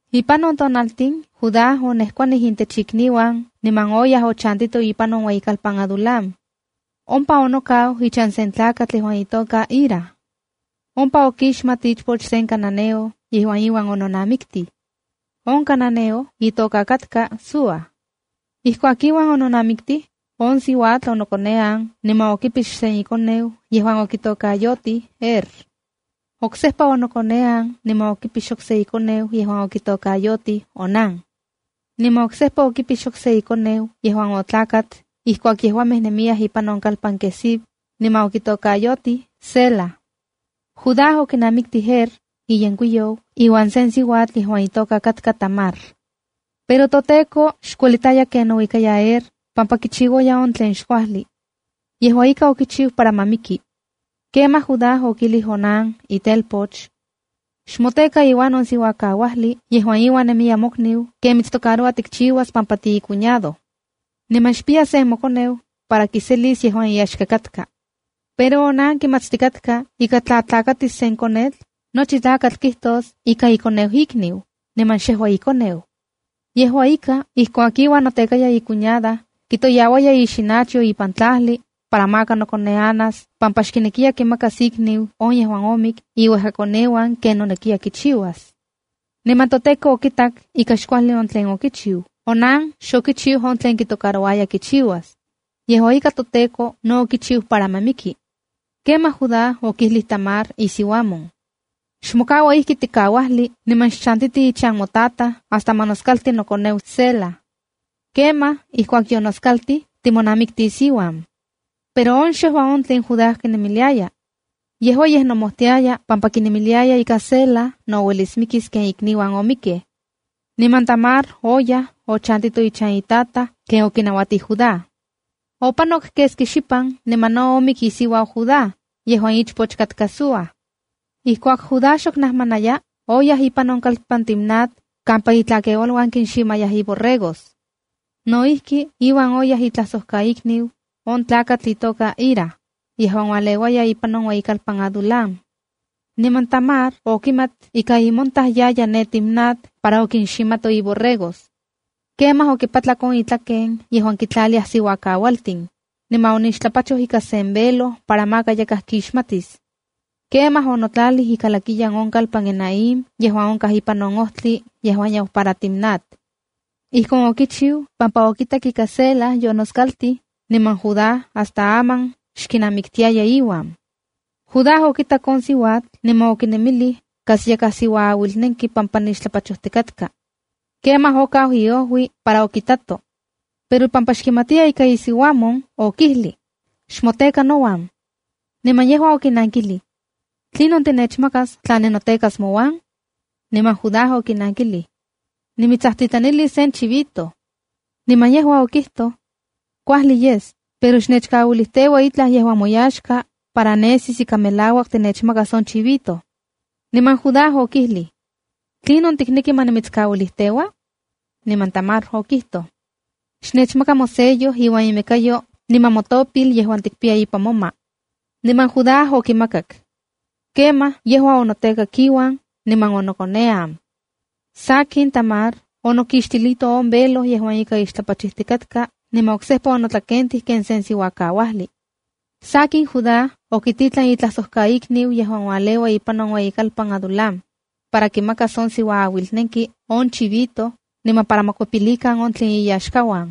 Ipan on tonaltin, Judá onejkuanij intech ikniuan niman oyaj ochantito ipan on ueyikalpan Adulam. Ompa onokau ichan sen tlakatl yejuan itoka Hira. Ompa okixmat ichpoch sen cananeo yejuan iuan ononamiktij. On cananeo itoka katka Súa. Ijkuak iuan yononamiktij, on siuatl onokonean niman okipix sen ikoneu yejuan okitokayotij Er. Oksejpa onokonean niman okipix okse ikoneu yejuan okitokayotij Onán. Niman oksejpa okipix okse ikoneu yejuan otlakat ijkuak yejuamej nemiyaj ipan on kalpan Quezib, niman okitokayotij Sela. Judá okinamiktij Er, iyenkuiyou, iuan sen siuatl yejuan itoka katka Tamar. Pero toTEKO xkuelitaya ken nouikaya Er pampa kichiuaya on tlen xkuajli. Yejua ika, okichiu para ma miki. Kemaj Judá okijlij Onán, itelpoch: —Xmoteka iuan on siuakauajli yejuan iuan nemiya mokniu ken mitstocaroua tikchiuas pampa tiicuñado. Niman xpiya sen mokoneu para kiselis yejuan iyaxka katka. Pero Onán kimatstikatka ika tla tlakatis sen konetl, nochi tlakatl kijtos ika ikoneu ikniu, niman xyejua ikoneu. Yejua ika, ijkuak iuan notekaya icuñada, kitoyauaya ixinachyo ipan tlajli para maka nokoneanas pampa xkinekiya kimakas ikniu on yejuan omik iuejkakoneuan ken nonekiya kichiuas. Niman toTEKO okitak ika xkuajli on tlen okichiu Onán pampa xokichiu on tlen kitocarouaya kichiuas. Yejua ika, toTEKO no okichiu para ma miki. Kemaj Judá okijlij Tamar isiuamon: —Xmokaua ijki tikauajli niman xchantiti ichan motataj hasta ma noskalti nokoneu Sela. Kemaj ijkuak yonoskaltij, timonamiktis iuan. (Pero on xejua on tlen Judá kinemiliaya. Yejua yej nomojtiaya pampa kinemiliaya ika Sela no uelis mikis ken ikniuan omikkej.) Niman Tamar oyaj, ochantito ichan itataj ken Judá okinauatij. Opanok keski xipan niman no omik isiuau Judá yejuan ichpoch katka Súa. Ijkuak Judá xok najmanaya, oyaj ipan on kalpan Timnat kampa itlakeualuan kinximayaj iborregos. No ijki, iuan oyaj itlajsojkaikniu, on tlakatl itoka Hira, yejuan ualeuaya ipan on ueyikalpan Adulam. Niman Tamar okimat ika imontaj yaya ne Timnat para okinximato iborregos. Kemaj okipatlak on itlaken yejuan kitlaliaj siuakauatsitsimej, niman onixtlapachoj ika sen velo para maka yakaj kixmatis. Kemaj onotlalij ikalakiyan on kalpan Enaim yejuan onkaj ipan on ojtli yejuan yau para Timnat. Ijkon okichiu pampa okitak ika Sela yonoskaltij niman Judá hasta aman xkinamiktiaya iuan. Judá okitak on siuatl niman okinemilij kas yakaj siuaauilnenki siuatl pampa nixtlapachojtikatka. Kemaj okau iojui para okitato. Pero pampa xkimatiya ika isiuamon, okijlij: —Xmoteka nouan. Niman yejua okinankilij: —¿Tlinon tinechmakas tla ninotekas mouan? Niman Judá okinankilij: —Nimitsajtitlanilis sen chivito. Niman yejua okijtoj: —Kuajli yes, pero xnechkauilijteua itlaj yejuan moyaxka para nesis ika melauak tinechmakas on chivito. Niman Judá okijlij: —¿Tlinon tikneki ma nimitskauilijteua? Niman Tamar okijtoj: —Xnechmaka mosello iuan imekayo niman motopil yejuan tikpiya ipan moma. Niman, Judá okimakak. Kemaj yejua onotekak iuan, niman onokonean. Sakin, Tamar onokixtilito on velo yejuan ika ixtlapachijtikatka niman oksejpa onotlakentij ken se siuakauajli. Sakin, Judá okititlan itlajsojkaikniu yejuan ualeua ipan on ueyikalpan Adulam, para kimakas on siuaauilnenki on chivito, niman para ma kikuepilikan on tlen iyaxkauan.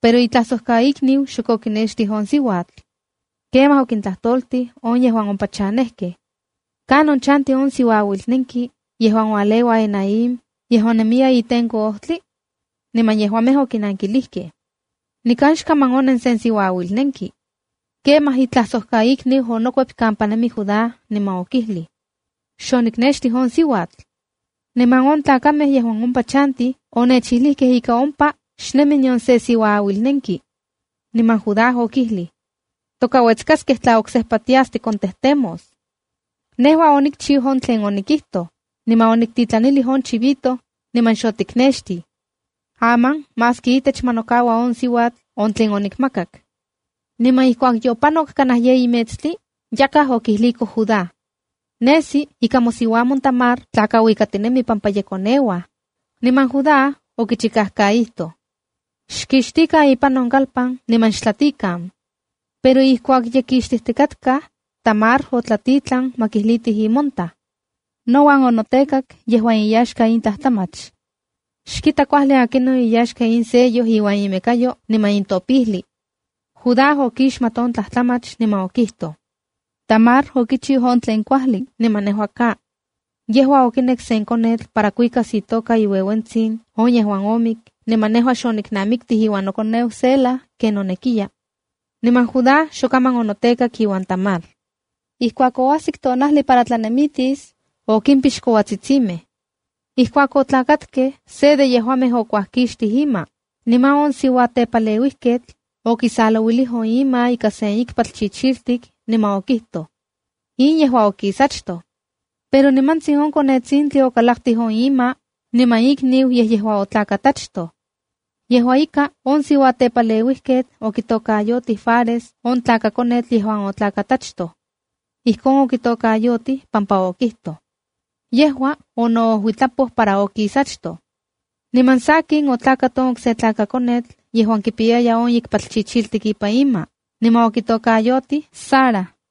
Pero itlajsojkaikniu xok okinextij on siuatl. Kemaj okintlajtoltij yejuan ompa chanejkej: —¿Kanon chanti on siuaauilnenki yejuan ualeua Enaim yejuan nemiya itenko ojtli? Niman okinankilijkej: —Nikan xkaman onen sen siuaauilnenki. Kemaj itlajsojkaikniu onokuep kampa nemi Judá niman okijlij: —Xoniknextij on siuatl. Niman on tlakamej yejuan ompa chantij onechilijkej ika ompa xnemi nion se siuaauilnenki. Niman Judá okijlij: —Tokauetskaskej tla oksejpa tias tikontejtemos. Nejua onikchiu on tlen onikijtoj, niman oniktitlanilij on chivito, niman xotiknextij. Aman maski itech, ma nokaua on siuatl on tlen onikmakak. Niman ijkuak yopanok kanaj yeyi metstli, yakaj okijliko Judá: —Nesi ika mosiuamon Tamar tlakauikatinemi pampa ye koneuaj. Niman Judá okichikajkaijtoj: —¡Xkixtikan ipan on kalpan niman xtlatikan! Pero ijkuak ye kixtijtikatkaj, Tamar otlatitlan ma kijlitij imontaj: “Nouan onotekak yejuan iyaxka in tlajtlamach. Xkita kuajli akinon iyaxka in sello iuan imekayo niman in topijli.” Judá okixmat on tlajtlamach niman okijtoj: “Tamar okichiu on tlen kuajli niman nejua ka. Yejua okinek sen konetl para kuikas itoka iueuentsin on yejuan omik niman nejua xoniknamiktij iuan nokoneu Sela ken nonekiya.” Niman Judá xokaman onotekak iuan Tamar. Ijkuak oajsik tonajli para tlanemitis, okimpix kouatsitsimej. Ijkuak otlakatkej, se de yejuamej okuajkixtij ima, niman on siuatepaleuijketl okisalouilij on ima ika sen ikpatl chichiltik niman okijtoj: “In yejua okis achtoj.” Pero nimantsin on konetsintli okikalaktij ima on niman ikniu yej yejua otlakat achtoj. Yejua ika, on siuatepaleuijketl okitokayotij Faresa on tlakakonetl yejuan otlakat achtoj. Ijkon okitokayotij pampa okijtoj: “Yejua onoojuitlapoj para okis achtoj.” Niman sakin, otlakat on okse tlakakonetl yejuan kipiyaya on ikpatl chichiltik ipan ima, niman okitokayotij Zarab.